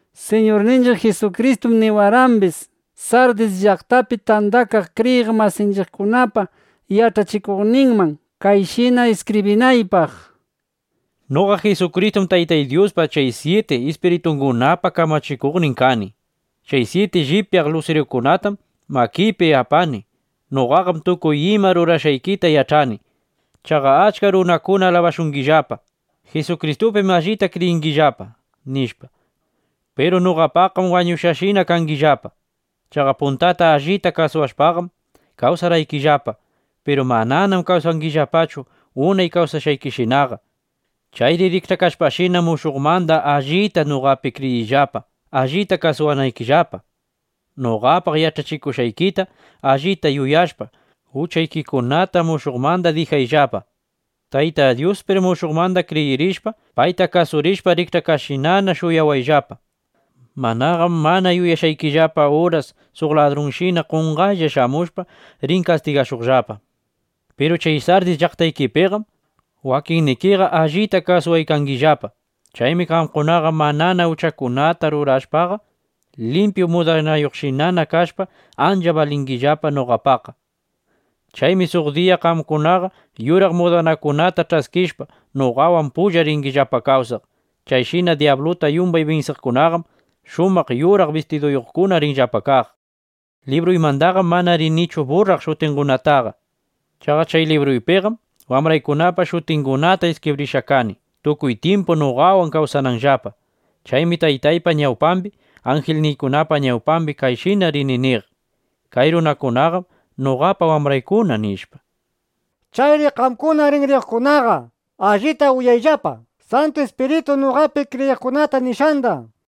Siñurninchiq Jisukristum niwarqambis, Sardis llaqtapi tandakaq kriyiq masinchiqkunapa yach'achikuqninman kayshina iskibrinaypaq: “Noqa Jisukristum Taytay Dyuspa chay syiti ispiritungunapa kamachikuqnin kani. Chay syiti llipyaq lusirukunatam makiypi apani. Noqaqam tukuy ima rurashqaykita yach'ani: Chaqa achka runakuna alabashungillapa: ‘Jisukristupim allita kriyinllapa’, nishpa. Piru noqapaqqam wañushqashinana kangillapa. Chaqa puntata allita kasuwashpaqam kawsarqaykillapa. Piru mananam kawsangillapachu unay kawsashqaykishinaqa. Chayri rikch'akashpashina, mushuqmanda allita noqapi kriyirishpa, allita kasuwayllapa. Noqapaq yach'akushqaykita allita yuyashpa, uchaykikunata mushuqmanda dijayllapa. Tayta Dyuspir mushuqmanda kriyirishpa, payta kasurishpa, rikch'akashqashina shuyawayllapa. Manaqam mana yuyashqaykillapa uras suq ladrunshina qonqaylla shamushpa, rini kastigashuqllapa. Piru chay Sardis llaqtaykipiqam wakinnikiqa allita kasuwaykangillapa. Chaymi qamkunaqa manana uchakunata rurashpaqa, limpyu mudanayuqshinana kashpa, ancha balingillapa noqapaqqa. Chaymi suq diya qamkunaqa yuraq mudanakunata ch'askishpa, noqawan pulla ringillapa kawsaq. Chayshina dyabluta yumbay binsiqkunaqam shumaq yuraq bistiduyuqkuna rinllapa kaq. Libruymandaqam mana rinichu burraq shutingunataqa. Chaqa chay libruypiqam wambraykunapa shutingunata iskibrishqa kani, tukuy tyimpu noqawan kawsananllapa. Chaymi Taytaypa ñawpambi, anjilningunapa ñawpambi kayshina rini niq: ‘Kay runakunaqam noqapa wambraykuna’, nishpa. Chayri qamkuna rinriyuqkunaqa allita uyayllapa Santu Ispirituy noqapi kriyiqkunata nishqanda”, nishpa.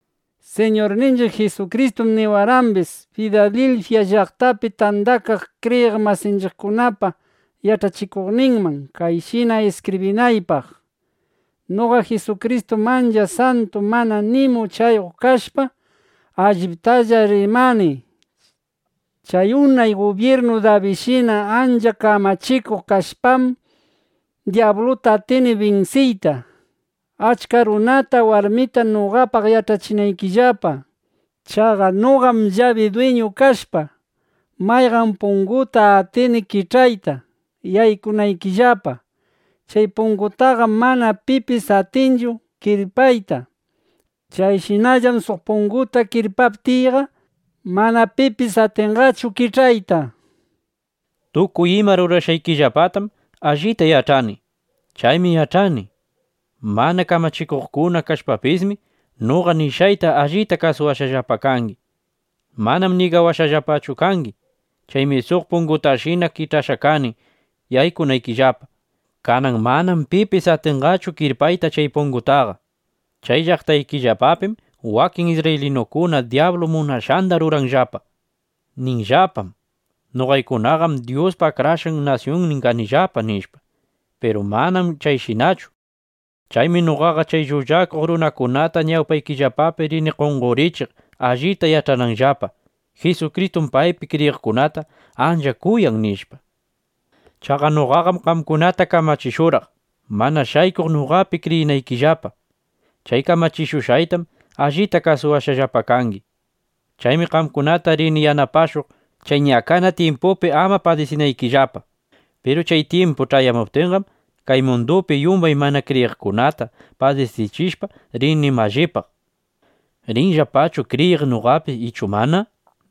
Siñurninchiq Jisukristum niwarqambis, Filadilfya llaqtapi tandakaq kriyiq masinchiqkunapa yach'achikuqninman kayshina iskibrinaypaq: “Noqa Jisukristum ancha santu mana nima uchayuq kashpa, alliptalla rimani. Chay unay gubyirnu Dabidshina ancha kamachikuq kashpam, dyabluta atini binsiyta, achka runata warmita noqapaq yach'achinaykillapa. Chaqa noqam llabi dwiñu kashpa, mayqan punguta atini kich'ayta, yaykunaykillapa. Chay pungutaqam mana pipis atinqachu kirpayta. Chayshinallam suq punguta kirpaptiyqa, mana pipis atinqachu kich'ayta. Tukuy ima rurashqaykillapatam allita yach'ani. Chaymi yach'ani: Mana kamachikuqkuna kashpapismi, noqa nishqayta allita kasushqallapa kangi. Manam ñigawashqallapachu kangi. Chaymi suq pungutashina kich'ashqa kani yaykunaykillapa. Kanan manam pipis atinqachu kirpayta chay pungutaqa. Chay llaqtaykillapapim wakin isrraylinukuna dyablu munashqanda ruranllapa. Ninllapam: ‘Noqaykunaqam Dyuspa akrashqa nasyunnin kanillapa’, nishpa. Piru manam chayshinachu. Chaymi noqaqa chay llullakuq runakunata ñawpaykillapapi rini qonqorichiq, allita yach'ananllapa: Jisukristum paypi kriyiqkunata ancha kuyan, nishpa. Chaqa noqaqam qamkunata kamachishurqaq, mana shaykuq noqapi kriyinaykillapa. Chay kamachishushqaytam allita kasuwashqallapa kangi. Chaymi qamkunata rini yanapashuq, chay ñakana tyimpupi ama padisinaykillapa. Piru chay tyimpu ch'ayamuptinqam, kay mundupi yumbay mana kriyiqkunata padisichishpa, rini mallipaq: ¿Rinllapachu kriyiq noqapi ichu mana?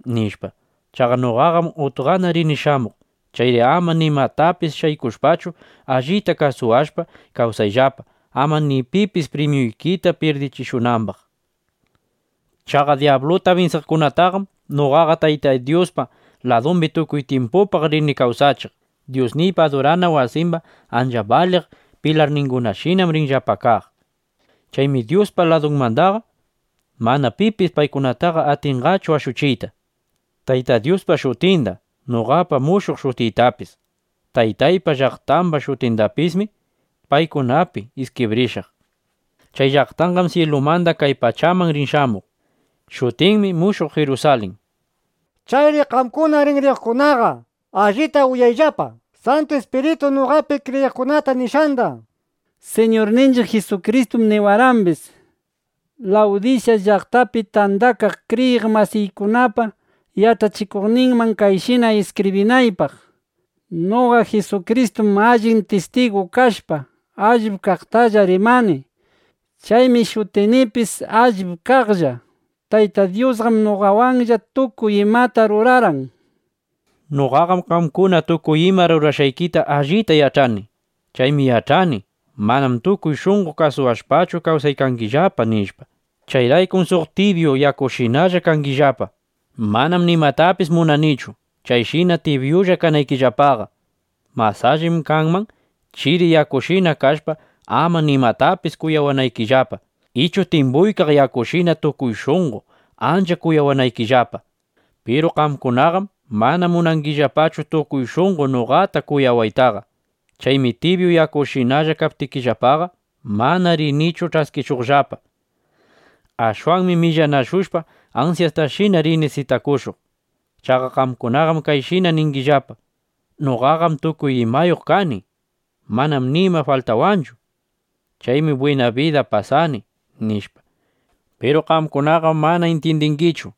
nishpa. Chaqa noqaqam utqana rini shamuq. Chayri ama nimatapis shaykushpachu, allita kasuwashpa kawsayllapa, ama ni pipis primyuykita pyirdichishunambaq. Chaqa dyabluta binsiqkunataqam noqaqa Taytay Dyuspa ladumbi tukuy tyimpupaq rini kawsachiq. Dyusniypa adurana wasimba ancha baliq pilarningunashinam rinllapa kaq. Chaymi Dyuspa ladunmandaqa mana pipis paykunataqa atinqachu ashuchiyta. Taytay Dyuspa shutinda, noqapa mushuq shutiytapis, Taytaypa llaqtamba shutindapismi paykunapi iskibrishaq. Chay llaqtanqam syilumanda kay pachaman rin shamuq. Shutinmi Mushuq Jirusalin. Chayri qamkuna rinriyuqkunaqa allita uyayllapa Santu Ispirituy noqapi kriyiqkunata nishqanda”, nishpa. Siñurninchiq Jisukristum niwarqambis, Lawdisya llaqtapi tandakaq kriyiq masinchiqkunapa yach'achikuqninman kayshina iskibrinaypaq: “Noqa Jisukristum allin tistigu kashpa, allip kaqtalla rimani. Chaymi shutinipis: ‘Allip kaqlla’. Taytay Dyusqam noqawanlla tukuy imata rurarqan. Noqaqam qamkuna tukuy ima rurashqaykita allita yach'ani. Chaymi yach'ani: Manam tukuy shunqo kuyawashpachu kawsaykangillapa, nishpa. Chayraykum suq tibyu yakushinalla kangillapa. ¡Manam nimatapis munanichu, chayshina tibyulla kanaykillapaqa! Mas allim kanman, chiri yakushina kashpa, ama nimatapis kuyawanaykillapa, ichu timbuykaq yakushina tukuy shunqo ancha kuyawanaykillapa. Piru qamkunaqam mana munangillapachu tukuy shunqo noqata kuyawaytaqa. Chaymi tibyu yakushinalla kaptikillapaqa, mana rinichu ch'askishuqllapa. Ashwanmi millanashushpa, ansyastashina rini sitakushuq. Chaqa qamkunaqam kayshina ningillapa: ‘Noqaqam tukuy imayuq kani. Manam nima faltawanchu. Chaymi bwina bida pasani’, nishpa. Piru qamkunaqam mana intyindingichu: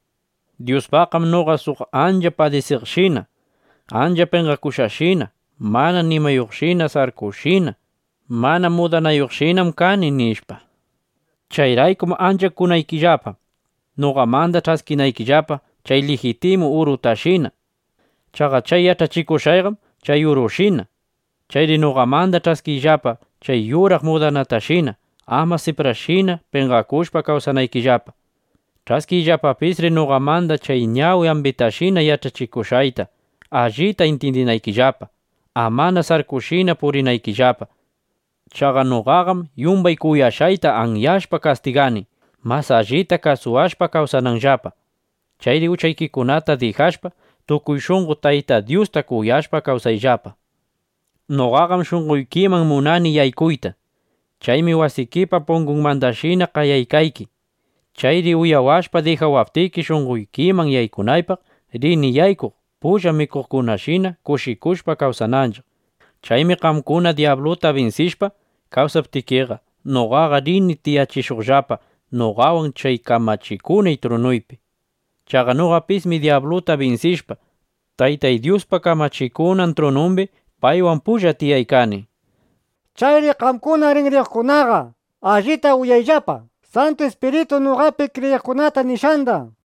Dyuspaqqam noqa suq ancha padisiqshina, ancha penqakuqshina, mana nimayuqshina, sarkushina, mana mudanayuqshinam kani, nishpa. Chayraykum ancha kunaykillapa, noqamanda ch'askinaykillapa chay lijitimu urutashina. (Chaqa chay yach'achikushqayqam chay urushina.) Chayri noqamanda ch'askiyllapa chay yuraq mudanatashina, ama siprallashina penqakushpa kawsanaykillapa. Ch'askiyllapapisri noqamanda chay ñawi ambitashina yach'achishushqayta, allita intyindinaykillapa, amana sarkushina purinaykillapa. Chaqa noqaqam yumbay kuyashqayta anyashpa kastigani, mas allita kasuwashpa kawsananllapa. Chayri uchaykikunata dijashpa, tukuy shunqo Tayta Dyusta kuyashpa kawsayllapa. Noqaqam shunqoykiman munani yaykuyta. Chaymi wasikipa pungunmandashina qayaykayki. Chayri uyawashpa dijawaptiki, shunqoykiman yaykunaypaq, rini yaykuq, pulla mikuqkunashina kushikushpa kawsananchiq. Chaymi qamkuna dyabluta binsishpa kawsaptikiqa, noqaqa rini tiyachishuqllapa noqawan chay kamachikunay trunuypi. Chaqa noqapismi dyabluta binsishpa, Taytay Dyuspa kamachikunan trunumbi paywan pulla tiyaykani. Chayri qamkuna rinriyuqkunaqa allita uyayllapa Santu Ispirituy noqapi kriyiqkunata nishqanda”, nishpa.